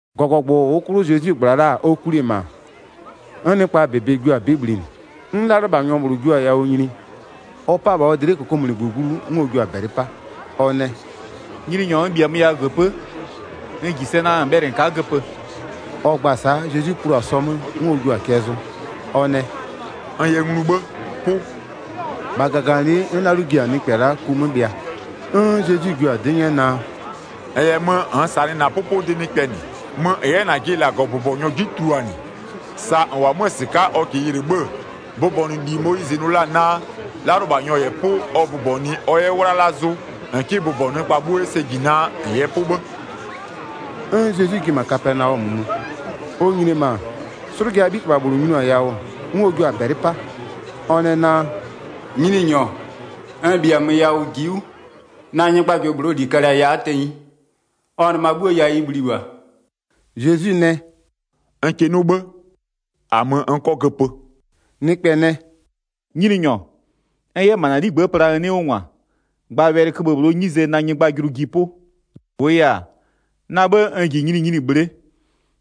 1-Gɔgɔgbʋ -ʋʋ 'klʋ Zezwi -gbla la-a ɔ kwli-e -ma, 'n nɩkpa -bebe jio-a 'bɩ bhlinɩ. 'N 'lalʋlɩbhanyɔ -bhlʋ jio-a yawʋ nyini, ɔ 'pa-a -bha ɔ dlɩ'ɩ -kokomunigbö glu, 'n ɔ jio-a -bɛlɩ 'pa, ɔ nɛ: “Nyininyɔ, n -bhiamö yawʋ -göpö'ö, n -ji sɛ naa -n bhɛlɩ -n ka'a göpö.” Ɔ gba-a sa'a, Zezwi plu-a sɔ 'mö, 'n ɔ jio-a cɛ zʋ. Ɔ nɛ: “N yɛ nglu 'bhë, 'pʋ.” -Bha -gaganɩlɩ'ɩ 'n 'lalʋ ji-a nɩkpɛ la'a ku 'mö bhɩa. 'N Zezwi jio-a 'dɩ 'nyɛ naa: “-N -yɛ mö -nn -sanɩ -na 'pʋpʋdɩ nɩkpɛ -nɩ. Mö -n 'yɛ -najɩ -Lagɔbʋbɔnyɔ 'ji tuluanɩ, sa -n -wʋ-ɔ 'mö-a -sɩka'a ɔ -kɩɩ yɩlɩ 'bhë-ë, bʋbɔnʋli Moyizɩ nʋ la-a naa 'lalʋlɩbhanyɔ -yɛ 'pʋ ɔ bʋbɔnɩɩ ɔ 'yɛ 'wlala zʋ, -n 'kɩ bʋbɔnʋ nɩkpa 'bhuo 'yɛ sɛ -ji naa -n yɛ 'pʋ 'bhë.” 'N Zezwi ji-e -ma Kapɛnaɔmö mö. Ɔ nyini-e -ma, 'slʋjaa 'bhitɩbha -bhlʋ nyiniɔ-a yawʋ, 'n ɔ jio-a -bɛlɩ 'pa, ɔ nɛ naa: “Nyininyɔ, n -bhiamö yawʋ ji'i 'wʋ, na nyɩgbajʋlʋ -bhlʋɔ -li kalɩ-a ya'a tenyi, ɔ nɩma 'bhuo yawʋ ɩ 'bhlio-o -bha.” Zezwi nɛ: “N kɩ 'nʋ 'bhë, -a mö n 'kɔ göpö.” Nɩkpɛ nɛ: “Nyininyɔ, -n 'yɛ -ma na 'ligbë'ë pla n 'nɩ 'wʋ -ngwa, gba wɛlɩköbhë -bhlʋɔ 'nyize na nyɩgbajʋlʋ ji 'pʋ. 9-Wʋʋ yɛ-a, na 'bhë n -ji nyininyini bhle'e.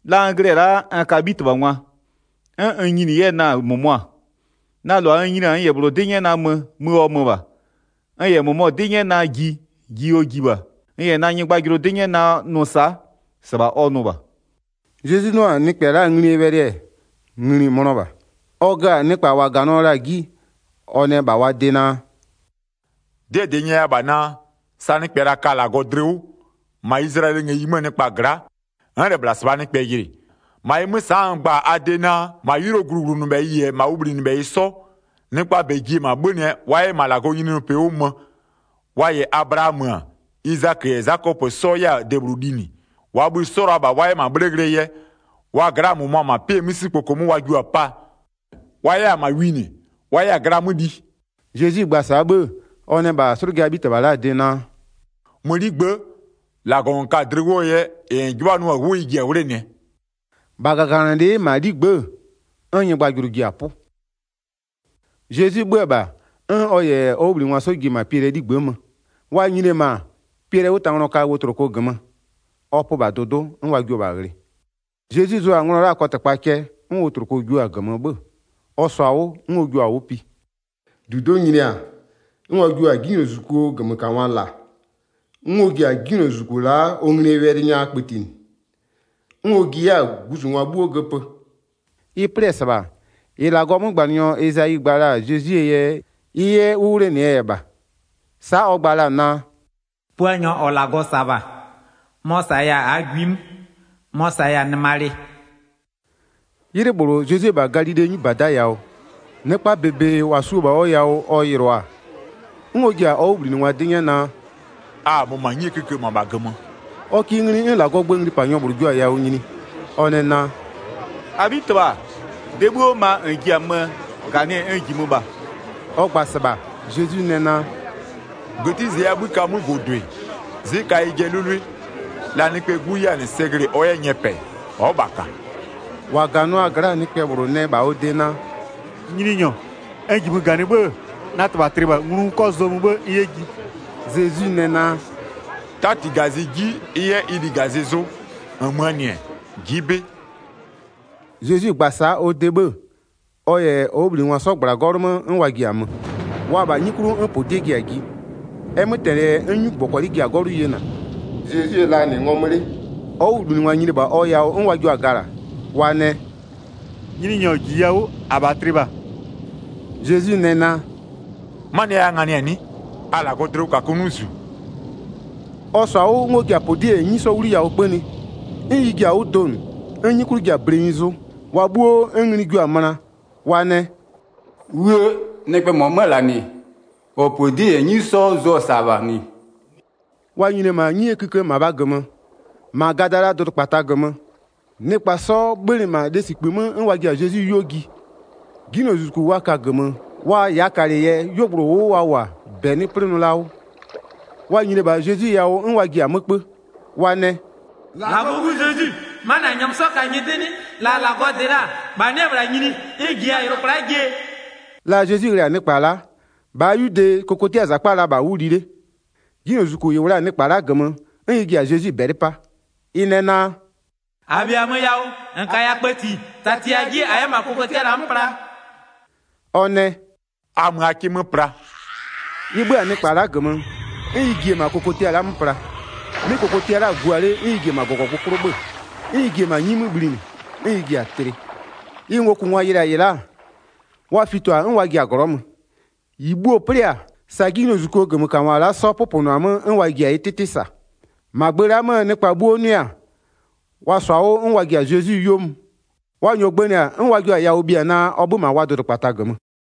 La n glɩ-ɛ la'a, n ka 'bhitɩbhangwa, 'n n nyini 'yɛ-ɛ na-a -mʋmʋa. Na -lʋa n nyini-a, n -yɛ -bhlʋ 'dɩ 'nyɛ naa mö, mö ɔ mö -bha, n -yɛ -mʋmɔ 'dɩ 'nyɛ naa ji, ji ɔ ji -bha. N -yɛ na nyɩgbajʋlʋ 'dɩ 'nyɛ naa nʋ sa'a, -sɩbha ɔ nʋ -bha.” Zezwi 'nʋ-a nɩkpɛ la'aa nglie wɛlɩ-ɛ, ngli-i mönɔ -bha. Ɔ gö-a nɩkpa -wa -ganɩɔ la-a 'ji, ɔ nɛ -bha wa de naa: “'Dɩɛ -dɩ n nyɛya -bha naa: Sa nɩkpɛ -la ka-a -Lagɔ dlɩ 'wʋ, -ma Izlayɛlɩɛ ngëyi 'möö nɩkpa gla'a, n'n -lɛ -bhla -sɩbhaa nɩkpɛ yɩlɩ. 11-Ma ɩ 'mö, sa'a n gba-a a de naa: -Ma 'ylʋɔ gluwlʋnʋbhɛyɩ -yɛ -ma ʋ bhlinɩbhɛyɩ 'sɔ, nɩkpaa -bɛ ji-e -ma 'bhönɩɛ wa 'yɛ -ma -Lagɔɔ nyininyinipɩ 'wʋ mö, wa -yɛ Ablaamö-ö, Izakö -yɛ Zakɔpö 'sɔ 'yɛ-a -ma debhlʋ linɩ. 12-Waa bhï-ï 'sɔ-ɔ la-a -bha wa 'yɛ -ma 'bhle ghlɩɛ yɛ, wa gla'aa -mʋmʋa -ma 'pɩɛ 'misikpoko 'mö wa jua-a 'paa, wa 'yɛ-a -ma winɩ, wa 'yɛ-a gla 'mö li.” Zezwi gba-a sa'a 'bhë-ë, ɔ nɛ -bha 'slʋjaa 'bhitɩbha la'aa de naa: “Mö 'ligbë'ë, -Lagɔ -n ka-a dlɩ 'wʋɔ yɛ -ɩ -n 'jɩbhanʋ-a 'wʋ ɩ ji-a 'wlenɩɛ.” -Bha -gaganɩlɩ'ɩ -ma 'ligbë'ë, n nyɩgbajʋlʋ ji-a 'pʋ. Zezwi 'bhö-ö -bha, 'n ɔ -yɛ ɔ 'wʋbhlinɩngwa 'sɔ ji-e -ma Piɛlɩɛ 'ligbë'ë mö. Wa nyini-e -ma, Piɛlɩɛ 'wʋtanglɔ ka wotloko -gömö, ɔ pö -bha dʋdʋ'ʋ 'n wa jio-o -bha ghlɩ. Zezwi zʋ-a nglɔ la'aa kɔtɩkpa cɛ, 'n wotloko jio-a -gömö 'bhö-ö. Ɔ -sɔ-a 'wʋ 'n ɔ jua-a 'wʋ pi. 16-Dudo'o nyini-a, 'n wa jio-a 'jinylozuzukuo -gömökangwa -la. 'N ɔ ji-a 'jinylozuzuku la'a ɔ nglie wɛlɩ nya kpëtinɩ, 'n ɔ ji 'yɛ-a guzungwa 'bhuo göpö. Ɩ 'plɩ-ɛ -sɩbha, -ɩ -Lagɔɔ 'mögbanɩnyɔ Ezayi gba la-a Zezwie yɛ ɩ 'yɛ 'wʋ 'wlenɩɛ yɛ -bha. Sa'a ɔ gba la-a naa: “Puanyɔ -ɔ -Lagɔ -sa-a -bha, mɔ-ɔ -saya-a -aa gwi 'mö, mɔ-ɔ -saya-a nɩmalɩ.” 'Ylɩ -bhlʋ Zezwi-e -bha Galilee 'nyibada yawʋ, nɩkpaa -bebe -wa su-o -bha ɔ yawʋ ɔ yɩlɩɔ-a, 'n ɔ ji-a ɔ 'wʋbhlinɩngwa 'dɩ 'nyɛ naa: “A-a mö -ma 'nyie kïkë -mabha -gömö.” Ɔ kɩ ngli 'n -Lagɔɔ gböö nglipanyɔ -bhlʋ jio-a yawʋ nyini, ɔ nɛ naa: “-Abhitɩbha, de 'bhuo ma -n ji-a möö -ganɩɛ n -jimö -bha.” Ɔ gba-a -sɩbha, Zezwi nɛ naa: “-Gëtizleyiaa 'bhï ka ɩ 'mögʋdʋɩ, 'zɩ ka ɩjɩɛ 'lʋlʋɩ, la Nɩkpɛɛ 'Gu 'yɛ-a -nɩ sɛ glɩ-ɩ ɔ 'yɛ nyɛpɛ, ɔ'ɔ -bha -ka.” 21-Wa -ganɩɔ-aa gla'a nɩkpɛ -bhlʋ nɛ -bha ɔ de naa: “Nyininyɔ, n -jimö -ganɩ 'bhë-ë, na -tɩbha tlɩ -bha, nglu n 'kɔ zʋɔ mö 'bhë n 'yɛ ji.” Zezwi nɛ naa: “'Tati -gazɩ 'ji ɩ 'yɛ ɩ ligazɩ zʋ. -Nmöö -nɩ-ɛ, ji'i 'bɩ.” Zezwi gba-a sa'a ɔ de 'bhë-ë, ɔ -yɛ ɔ 'wʋbhlinɩngwa 'sɔ -gbla-a 'gɔlʋ 'mö 'n wa ji-a mö. Wa-a -bha 'nyi 'klʋ 'n -podie ji-a ji, ɛ 'mötɛnɩ yɛ 'n 'nyugbɔkɔlɩ ji-a 'gɔlʋ yena. Zezwi-e la -nɩ ngɔmö 'le. Ɔ 'wʋbhlinɩngwa nyini-e -bha ɔ yawʋ 'n wa jio-a gala, wa nɛ: “Nyininyɔ, -jiya 'wʋ! -Abha tlɩ -bha!” Zezwi nɛ naa: “'Manɩɛ yɛ a nganɩ-a 'nɩ? A -Lagɔɔ dlɩwʋkakʋ 'nɩ -zu.” Ɔ -sɔ-a 'wʋ 'n ɔ ji-a -podie -yɛ 'nyi 'sɔ 'wliyawʋ 'kpönɩ, 'n ɩ ji-a 'wʋ donʋ, 'n 'nyi 'klʋ ji-a blenyi zʋ. Wa 'bhuo 'n ngli jua-a möna, wa nɛ: “'Wuë! Nɩkpɛɛ -mɔ 'mö-ö -la -nɩ, -ɔ -podie -yɛ 'nyi 'sɔ zʋ-ɔ -sa -bha 'nɩ?” Wa nyini-e -ma 'nyie 'kïkë -mabhaa -gömö, -ma Gadalaa dʋdʋkpata -gömö, nɩkpa 'sɔ 'bhönɩ -ma lesikpï 'mö 'n wa ji-a Zezwi 'yuo ji. 'Jinylozuzuku wa ka-a -gömö, wa -yaakalɩ yɛ, 'yuogblʋ -ʋʋ 'wʋ wa -wʋ-a, -bɛ 'nɩ 'plɩnʋ la 'wʋ. Wa nyini-e -bha Zezwi yawʋ 'n wa ji-a 'mö 'kpö, wa nɛ: “-Lagɔɔ 'Gu Zezwi, 'manɩ -a -nyɛmö 'sɔ ka-a nyɩdɩ 'nɩ? La -Lagɔ -dɩ la-a -bha 'nɩ-ɛ -bhla nyini 'n -n -jiya-a yʋlʋa kwla'a jie?” La Zezwi ghlɩ-a nɩkpa la'a, -bhaa 'yude kokotiaa -zakpa-a la -bha 'wʋ li 'le. 'Jinylozuzuku -ɩ -wʋ la-a nɩkpa la'a -gömö, 'n ɩ ji-a Zezwi -bɛlɩ 'pa, ɩ nɛ naa: “-A -bhiamö yawʋ, -n -kaya kpëti, -tatiya 'ji -a 'yɛ -ma kokotia -la 'mö pla.” Ɔ nɛ: “A mö a 'kɩ 'mö pla.” Ɩ 'bhö-a nɩkpa la'a -gömö, 'n ɩ ji-e -ma kokotia la'a 'mö pla. 'Mɩ kokotia la'a-a gua 'le 'n ɩ ji-e -ma -gɔgɔ 'klʋ 'bhö-ö, 'n ɩ ji-e -ma 'nyi 'mö bhlinɩ, 'n ɩ ji-a tlɩ. Ɩ ngokʋngwa yɩlɩ-a -ɩ la'a, wa fito-a 'n wa ji-a glɔ'ɔ mö, -ɩ bhuo-o 'plɩ-a, sa 'jinylozuzukuo -gömökangwa la'a 'sɔ 'pʋpʋnʋ-a 'mö, 'n wa ji-a ɩ 'tɩtɩ -sa. 34-Ma gbë la'a 'möö nɩkpa 'bhuo 'nʋɩ-a, wa -sɔ-a 'wʋ 'n wa ji-a Zezwi 'yuo mö, wa -nyɔɔ gbënɩ-a, 'n wa jio-a yawʋ bhia naa ɔ 'bhö-ö -ma wa dʋdʋkpata -gömö.